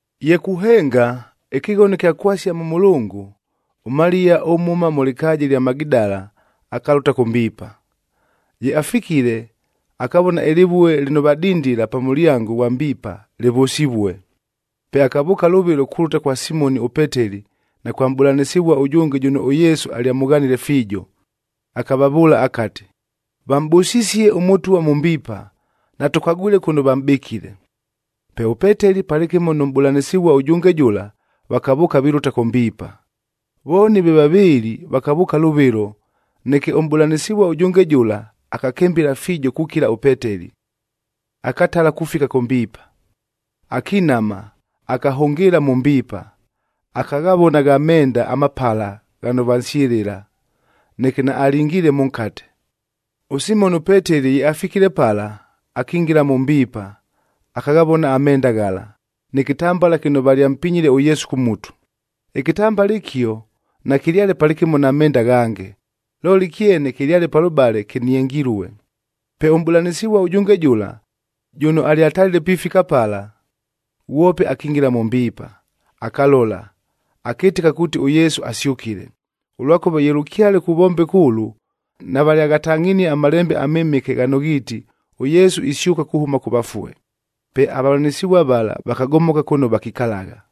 Ye kuhenga, ɨkɨghono ɨkya kwasia mʉ mʉlʉngʉ, ʉMaliya ʉmhʉma mʉ lɨkaaja ɨlya Magidala akalʉta kʉ mbiipa. Ye afikile, akavona ɨlɨvue lɨno vadindila pa mʉlyango ghwa mbiipa, lɨvʉsivue. Pe akavʉʉka lʉvɨlo kulʉta kwa Simoni ʉPeteli na kwa mʼbʉlanɨsɨvua ʉjʉnge jʉno ʉYesu alyamʉghanile fiijo, akavavʉʉla akati, “Vamʼbʉsisie ʉMʉtwa mʉ mbiipa, natʉkagwile kʉno vamʼbɨkile!” Pe ʉPeteli palɨkɨmo nʉ mʼbʉlanɨsɨvua ʉjʉnge jʉla, vakavʉʉka, vilʉta kʉ mbiipa. Vooni ve vavɨɨlɨ vakavʉʉka lʉvɨlo, neke ʉmʼbʉlanɨsɨvua ʉjʉnge jʉla, akakɨmbɨla fiijo kukila ʉPeteli, akatala kufika kʉ mbiipa. Akinama, akahʉngɨɨla mʉ mbiipa, akaghavona gha menda amapala ghano vansyɨlɨla, neke naalingiile mʉnkate. ɄSimoni ʉPeteli ye afikile pala, akingila mʉ mbiipa akaghavona amenda ghala, nɨ kɨtambala kɨno valyampinyile ʉYesu kʉ mutu. Ɨkɨtambala ɨkio nakɨlyale palɨkɨmo na menda aghange, looli ɨkyene kɨlyale palʉbale kɨniengilue. Pe ʉmʼbʉlanɨsɨvua ʉjʉnge jʉla, jʉno alyatalile pifika pala, ghwope akingila mʉ mbiipa, akalola, akɨtɨka kuuti ʉYesu asyʉkile. Ʉlwakʉva ye lʉkyale kuvombeka ʉlʉ, navalyaghatangʼhinie aMalembe aMɨmɨke ghano ghiiti ʉYesu isyʉka kuhʉma kʉ vafue. Pe avavʉlanɨsɨvua vala, vakagomoka kʉno vakikalagha.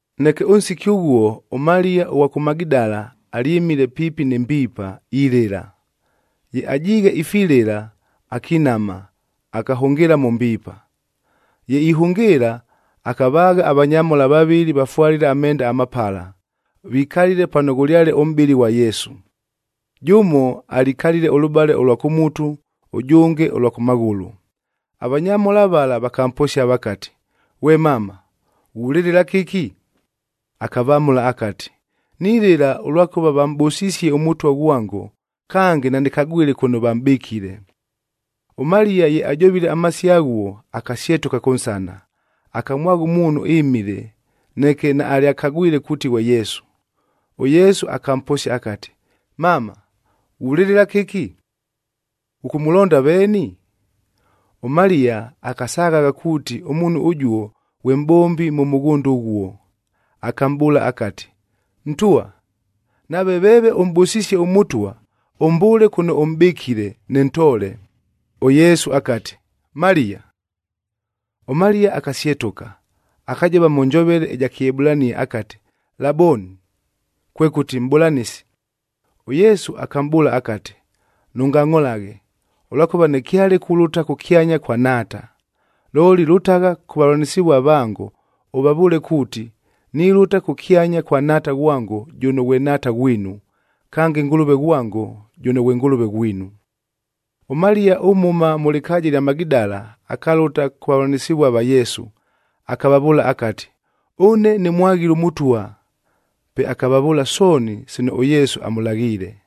Neke ʉnsiki ʉghuo ʉMaliya ʉghwa kʉ Magidala alyɨmile piipi nɨ mbiipa, ilɨla. Ye ajiighe ifilɨla akinama, akahʉngɨɨla mʉ mbiipa. Ye ihʉngɨɨla, akavaagha avanyamhola vavɨlɨ vafwalile amenda amapala, vikalile pano ghʉlyale ʉmʼbɨlɨ ghwa Yesu. Jʉmo alikalile ʉlʉbale ʉlwa kʉ mutu, ʉjʉnge ʉlwa kʉ maghʉlʉ. Avanyamhola vala vakamposia vakati, “Ghwe mama, ghulɨlɨla kɨki?” Akavamʉla akati, “Nilɨla ʉlwakʉva vamʼbʉsisie ʉMʉtwa ghwango, kange nanɨkagwile kʉno vamʼbɨkile.” ɄMaliya ye ajovile amasio aghuo, akasyetʉka kʉnsana, akamwagha ʉmuunhu ɨmile, neke naalyakagwile kuuti ghwe Yesu. ɄYesu akamposia akati, “Mama, ghulɨlɨla kɨki? Ghʉkʉmʉlonda veeni?” ɄMaliya akasaghagha kuuti ʉmuunhu ʉjuo ghwe mʼbombi mʉ mʉghʉnda ʉghuo. Akamʼbʉʉla akati, “Ntwa, nave veeve ʉmʼbʉsisie ʉMʉtwa, ʉmbʉʉle kʉno ʉmʼbɨkile, nɨntoole.” ɄYesu akati, “Maliya!” ɄMaliya akasyetʉka, akajova mʉ njovele ɨja Kɨebulania akati, “Laboni,” kwekʉti, “Mʼbʉlanɨsi.” ɄYesu akamʼbʉʉla akati, “Nʉngangʼholaghe, ʉlwakʉva nɨkyale kulʉta kʉkyanya kwa Nhaata. Looli lʉtagha kʉ vavʉlanɨsɨvua vango,a ʉvavʉʉle kuuti, nilʉta kʉkyanya kwa Nhaata ghwango, jʉno ghwe Nhaata ghwinu, kange Ngʉlʉve ghwango, jʉno ghwe Ngʉlʉve ghwinu.” ɄMaliya ʉmhʉma mʉ lɨkaaja ɨlya Magidala akalʉta kʉ vavʉlanɨsɨvua va Yesu, akavavʉʉla akati, “Ʉne nɨmwaghile ʉMʉtwa!” Pe akavavʉʉla sooni sino ʉYesu amʉlaghiile.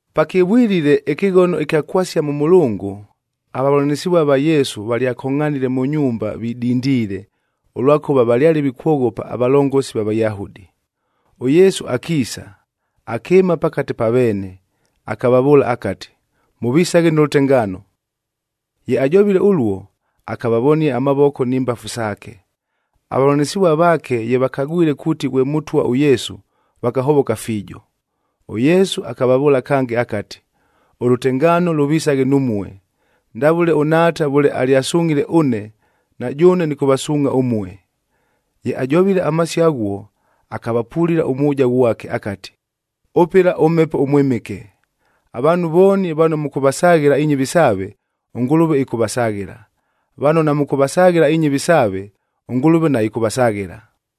Pakɨvwilile ɨkɨghono ɨkya kwasia mʉ mʉlʉngʉ, avavʉlanɨsɨvua va Yesu valyakongʼhanile mʉ nyumba vidindiile, ʉlwakʉva valyale vikwoghopa avalongosi va Vayahudi. ɄYesu akiisa, akɨɨma pakate pa veene, akavavʉʉla akati, “Mʉvisaghe nʉ lʉtengaano!” Ye ajovile ʉluo, akavavonia amavoko ni mbafu saake. Avavʉlanɨsɨvua vaake ye vakagwile kuuti ghwe Mʉtwa ʉYesu, vakahovoka fiijo. ɄYesu akavavʉʉla kange akati, “Ʉlʉtengaano lʉvisaghe numue. Ndavʉle ʉNhaata vʉle alyasungʼhile ʉne, na jʉʉne nɨkʉvasuungʼha ʉmue.” Ye ajovile amasio aghuo, akavapulila ʉmwʉja ghwake akati, “Ʉpɨla ʉMhepo ʉMwɨmɨke. Avaanhu vooni vano mʉkʉvasaghɨla inyɨvi saave, ʉNgʉlʉve ɨkʉvasaghɨla; vano namʉkʉvasaghɨla inyɨvi saave, ʉNgʉlʉve naɨkʉvasaghɨla.”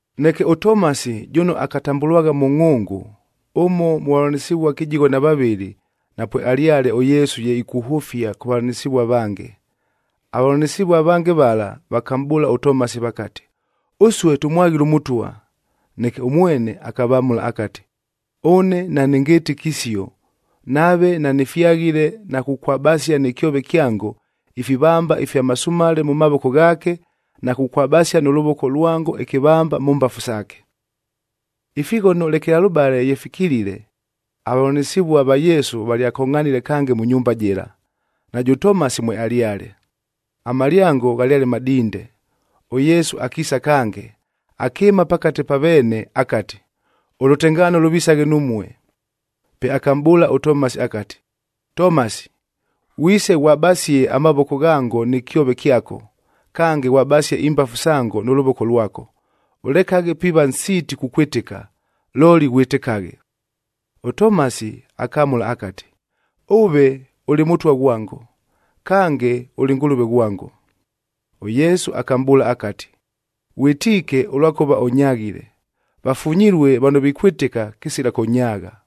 Neke ʉTomasi jʉno akatambʉlwagha Mʉngʼhʉngʉ, ʉmo mʉ vavʉlanɨsɨvua kɨjigho na vavɨlɨ, napwealyale ʉYesu ye ikuhʉfia kʉ vavʉlanɨsɨvua avange. Avavʉlanɨsɨvua avange vala, vakamʼbʉʉla ʉTomasi vakati, “Ʉsue tʉmwaghile ʉMʉtwa.” Neke ʉmwene akavamʉla akati, “Ʉne nanɨngɨtɨke isio, nave nanɨfyaghile na kukwabasia nɨ kyove kyango ifivamba ifya masumale mʉ mavoko ghaake, na kukwabasia nʉ lʉvoko lwango ɨkɨvamba mʉ mbafu saake.” Ifighono lekelalʉbale ye fikilile, avavʉlanɨsɨvua va Yesu valyakongʼhanile kange mʉ nyumba jɨla, najʉ Tomasi mwealyale. Amalyango ghalyale madinde, ʉYesu akiisa kange, akɨɨma pakate pa veene akati, “Ʉlʉtengaano lʉvisaghe numue.” Pe akamʼbʉʉla ʉTomasi akati, “Tomasi, ghwise ghwabasie amavoko ghango nɨ kyove kyako, kange ghwabasie imbafu sango nʉ lʉvoko lwako. Ʉlekaghe piiva nsiiti kukwɨtɨka, looli ghwɨtɨkaghe.” ɄTomasi akamʉla akati, “Ʉve ʉlɨ Mʉtwa ghwango! Kange, ʉlɨ Ngʉlʉve ghwango!” ɄYesu akamʼbʉʉla akati, “Ghwɨtiike ʉlwakʉva ʉnyaghile! Vafunyilue vano vikwɨtɨka, kɨsila kʉnyaagha.”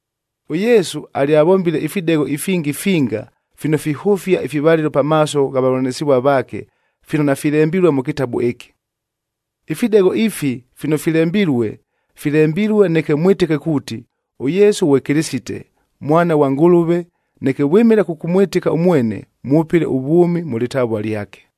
ɄYesu alyavombile ifidegho ifingi finga fino fihʉfia ifivalɨlo pamaaso gha vavʉlanɨsɨvua vaake fino nafilembilue mʉ kɨtabu ɨkɨ. Ifidegho ifi fino filembilue, filembilue neke mwɨtɨke kuuti, ʉYesu ghwe Kɨlɨsite, Mwana ghwa Ngʉlʉve, neke vwɨmɨla kʉkʉmwɨtɨka ʉmwene, mwʉpɨle ʉvwʉmi mʉ lɨtavua lyake.